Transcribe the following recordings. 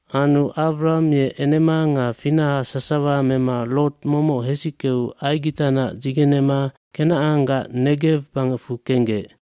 aAnu Awram ye enema nga finaha sasawa mema Lot momoc hesickeu Aigitanac dzigenema Kenacanggac Negew bangecfu kenggec.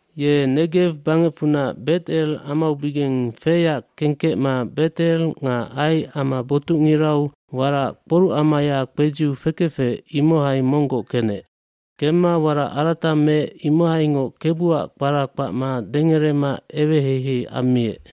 Ye Negew bangecfunac Bet El amaubigeng feyac kengkecma Bet El nga Ai ama botucngirau warac kporucamaya kpedziu fekefec imohai monggoc kenec. cKemma warac arata meec imohaingoc Kebuac kpara kpacma dengerema eweheihei ammiec.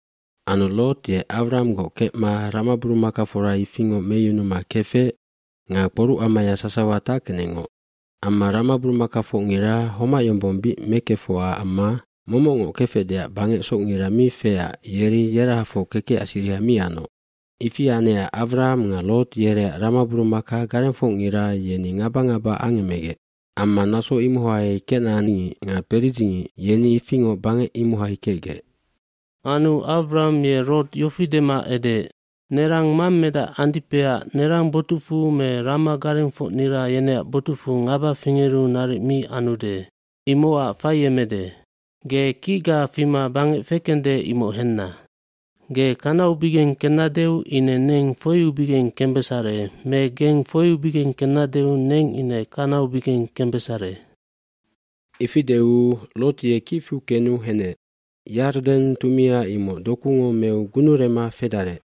Anu Lot ye Awranggoc kecma ramaburumakafora ifingoc meyunuma kefec nga kporucamaya sasawa tackenecngoc. Amma ramaburumakafocngira homac yombong bic mekefocac amma momocngoc kefecdeac bangec socngina mi feecac yeri yerahafoc kekecac siriha mi anoc. Ifi anecac Awram nga Lot yereac ramaburumaka garengfocngira yeni ngaba ngaba angemegec. Amma naso imohai kenacangngic nga peridzingic yeni ifingoc bangec imohai kecgec. Anu Awram ye Lot yofi dema edeec, “Nerang mammedac andipeac nerang botucfu me rama garengfocnira yeneac botucfu ngaba fingeru naric mi anude. Imocac faiemede. Ge kicga fima bangec fekende imoc henna. Ge kanaubigeng kennadeu ine neng foiubigeng kembesare me geng foiubigeng kennadeu neng ine kanaubigeng kembesare.” Ifi deu Lot ye kiwa fiu kenu henec. Henu Yarden tumia imoc dokungo meu gunurema fedarec.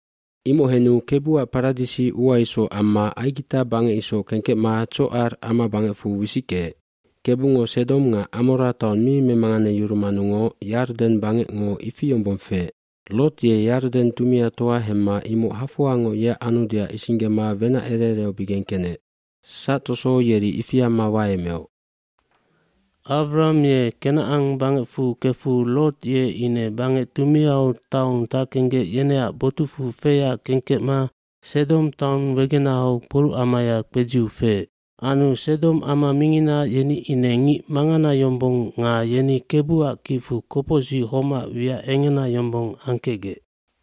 Imoc henu Kebuac paradisi ua isoc amma Aigita bangec isoc kengkecma Tsocar amabangecfu wisickeec. Kebungo Sedom nga Amora taong mi memanganeyurumanungoc Yarden bangecngo ifi yombong feec. Lot ye Yarden tumiatoa hemma imoc hafoangoc yeac anudeac isinggema wenac ere ereaubigeng kenec. Sactoso yeri ifi amma waemeoc. Awram ye Kenacan bangecfu kefu Lot ye ine bangec tumiau taun tackenggec yeneac botucfu feyac kengkecma Sedom taun wegenahau kporucamaya kpedziu feec. dAnu Sedom ama mingina yeni ine ngic mangana yombong nga yeni Kebuac kicfu kopocsic homac wiac engena yombong angkecgec.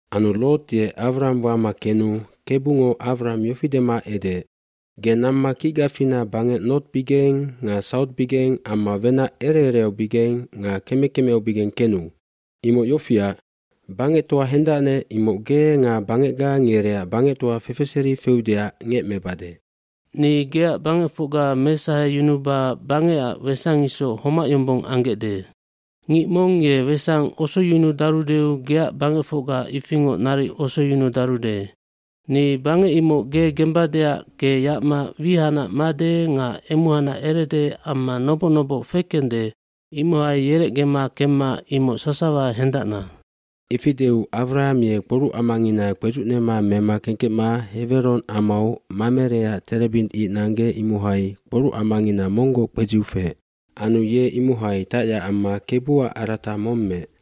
Anu Lot ye Awram wama kenu Kebungo Awram yofi dema edeec, “Ge namma kicga fina bangec nortbigeng nga sautbigeng amma wenac ere ereaubigeng nga keme kemeaubigeng kenu. eImoc yofiac, bangectoa hendacnec imoc ge nga bangecga ngereac bangectoa fefeseri feudeac ngemecbade. fNi geac bangecfocga mesaheyunuba bangecac sangi isoc homac yombong anggecde. Ngic mong ye sangi osoyunudarudeu ye geac bangecfocga ifingoc naric osoyunudarude. Ni bangec imoc ge gembadeac ge yacma wihanac made nga emuhacnac erede amma noboc noboc fekende imohai yerecgema kemma imoc sasawa hendacna.” gIfi deu Awram ye kporucamangina kpedzucnema mema kengkecma Heweron amau Mamereac terebint ic nanggec imohai kporucamangina monggoc kpedziu feec. Anu ye imohai tacyac amma Kebuac arata mong meec.